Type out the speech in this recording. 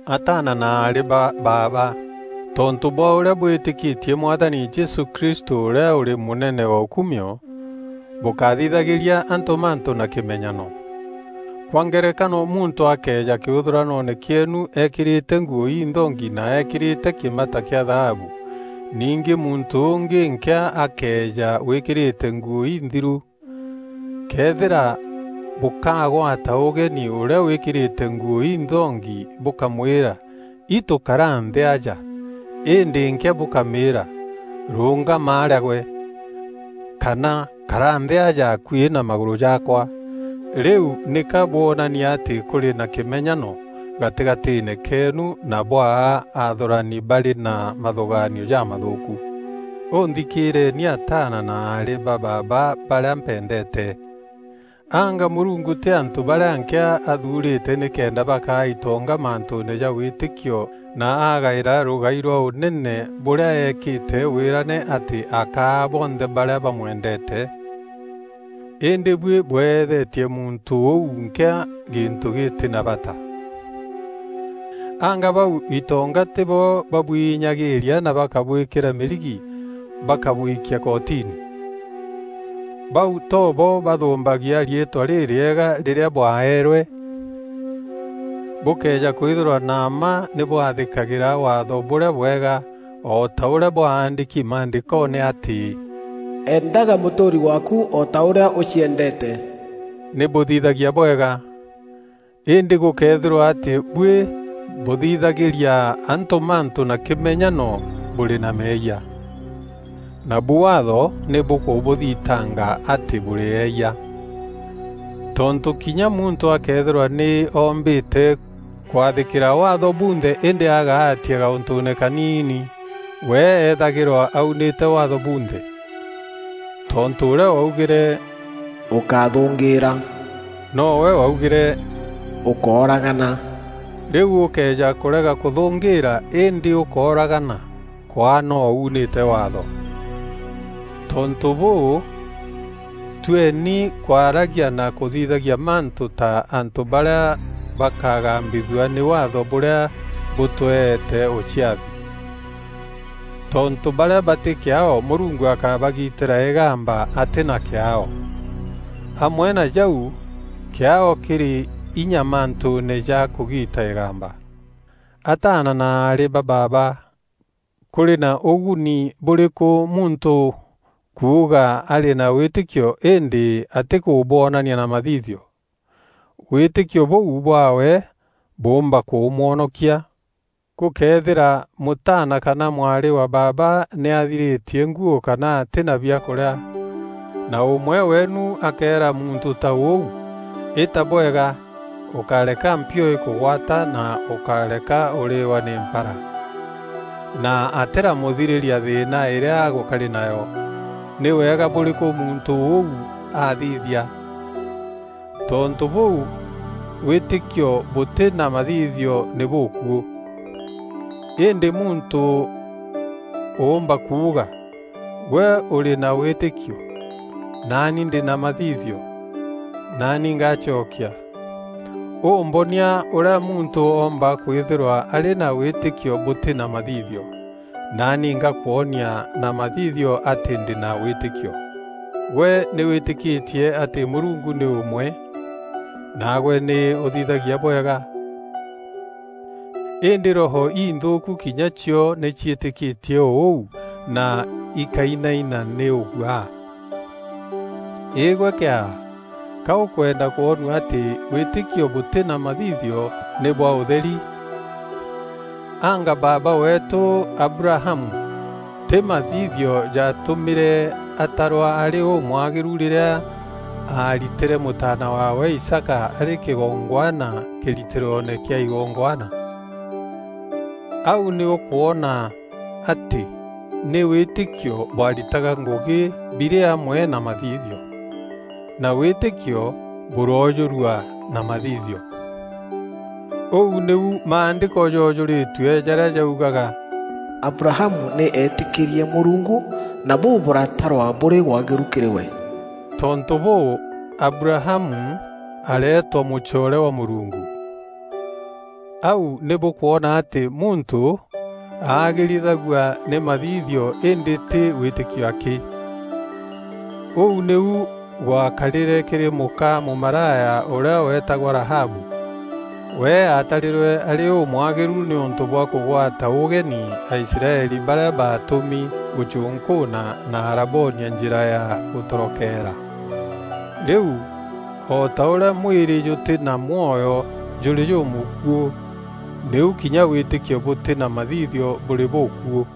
Ataana na aarî ba baaba, tontû bwa ûrîa bwîtîkîtie Mwathani Jesû Kristû ûrîa ûrî mûnene wa ûkumio, bûkáthithagîria antû mantû na kîmenyano. Kwa ngerekano, muntû akeeja kîûthûranoone kîeenu eekîrîte nguû inthongi na eekîrîte kîmata kîa thaabu, ningî muntû ûngî nkîa akeeja wîkîrîte nguû inthiru. Këethîra bûkagwata ûgeni ûrîa wîkîrîte nguû inthongi bûkamwîra, “Itû kara nthî aja,” îndî nkîa bûkamîra, “Rûûngama arîa gwe,” kana “Kara nthî aja akuî na magûrû jaakwa,” rîu nîka bwonania atî kûrî na kîmenyano gatîgatîîne keenu na bwaa aathûrani barî na mathûgaanio jamathûûku. Ûnthikîîreni ataana na aarî ba baaba barîa mpendeete! Anga Mûrungu tî antû barîa nkîa athuurîte nîkenda bakaa itonga mantûûne ja wîtîkio na agaîra rûgai rwa ûnene bûrîa eekîte wîrane atî akaa bonthe barîa bamwendeete? Îndî buî bweethetie muntû ûu nkîa gîntû gîtî na bata. Anga bau itonga tîbo babûinyagîîria na bakabwîkîra mîrigi bakabwikia kotini? Bau too bo bathûmbagia riîtwa rîrîega rîrîa bwaeerwe? Bûkëeja kwîthîrwa na mma nî bwathîkagîra Waatho bûrîa bwega o ta ûrîa bwandîki Maandîkoone atî, “Eendaga mûtûûri waaku o ta ûrîa ûciendeete,” nî bûthithagia bwega. Îndî gûkëethîrwa atî buî bûthithagîria antû mantû na kîmenyano bûrî na meeyia. Nabu Waatho nî bûkûbûthitanga atî bûrî eeyia. Tontû kinya muntû akeethîrwa nî ombîte kwathîkîra Waatho bunthe îndî agaatia gaûntûûne kaniini, we eethagîrwa aunîte Waatho bunthe. Tontû ûrîa waugîre “Ûkáthûngîîra,” nowe waugîre, “Ûkóragana.” Rîu ûkëeja kûrega kûthûngîîra îndî ûkooragana, kwaa no unîte Waatho. Tontû bûû, tueni kwaragia na kûthithagia mantû ta antû barîa bakagambithua nî Waatho bûrîa bûtweete ûciathi. Tontû barîa batî kîaao Mûrungu akabagîtîra îgamba atî na kîaao. Amwe na jau kîaao kîrî inya mantûûne ja kûgiita îgamba. Ataana na aarî ba baaba, kûrî na ûguni bûrî kû muntû kuuga arî na wîtîkio îndî atîkûbwonania na mathithio? Wîtîkio bûu bwaawe bûûmba kûmwonokia? Gûkëethîra mûtaana kana mwarî wa baaba nî athirîtie nguû kana atî na biakûrîa, na ûmwe weenu akeera muntû ta ûu, “Îta bwega, ûkáreka mpio îkûgwata na ûkáreka ûrîîwa nî mpara”, na atîramûthirîria thîîna îrîa agûkarî nayo, nî wega bûrîkû muntû ûu athithia? Tontû bûû wîtîkio bûtî na mathithio nî bûkuû. Îndî muntû ûûmba kuuga: “Gwe ûrî na wîtîkio, naani ndî na mathithio.” Naani ngacokia, “Û mbonia ûrîa muntû oomba kwîthîrwa arî na wîtîkio bûtî na mathithio, naani ngakwonia na mathithio atî ndî na wîtîkio.” Gwe nî wîtîkîtie atî Mûrungu nî ûmwe; naagwe nî ûthithagia bwega. Îndî roho inthûûku kinya cio nî ciîtîkîtie o ûu na ikainaina nî ûguaa. Îgwe kîaa, ka ûkwenda kwonua atî wîtîkio bûtî na mathithio nî bwa ûtheri? Anga baaba weetû Abrahamu, tî mathithio jatûmîre atarwa arî ûmwagîru rîrîa aaritîre mûtaana waawe Isaaka arî kîgongwana kîritîroone kîa igongwana? Au nî ûkwona atî nî wîtîkio bwaritaga ngûgî birî amwe na mathithio, na wîtîkio bûroojûrua na mathithio. Ûu nîu Maandîko joojûrîrue jarîa jaugaga, “Abrahamu nî eetîkîrie Mûrungu, na bûu bûratarwa bûrî waagîru kîrî we.” Tontû bûû, Abrahamu areetwa mûcoore wa Mûrungu. Au nî bûkwona atî muntû aagîrithagua nî mathithio îndî tî wîtîkio akî. Ûu nîu gwakarîre kîrî mûka mûmaraya ûrîa weetagwa Rahabu. We aatarîrwe arî ûmwagîru nîûntû bwa kûgwata ûgeni Aisraeli barîa baatûmi gûcûnkûûna na araboonia njîra ya gûtorokeera. Rîu, o ta ûrîa mwîrî jûtî na mwoyo jûrî jûmûkuû, nîu kinya wîtîkio bûtî na mathithio bûrî bûkuû.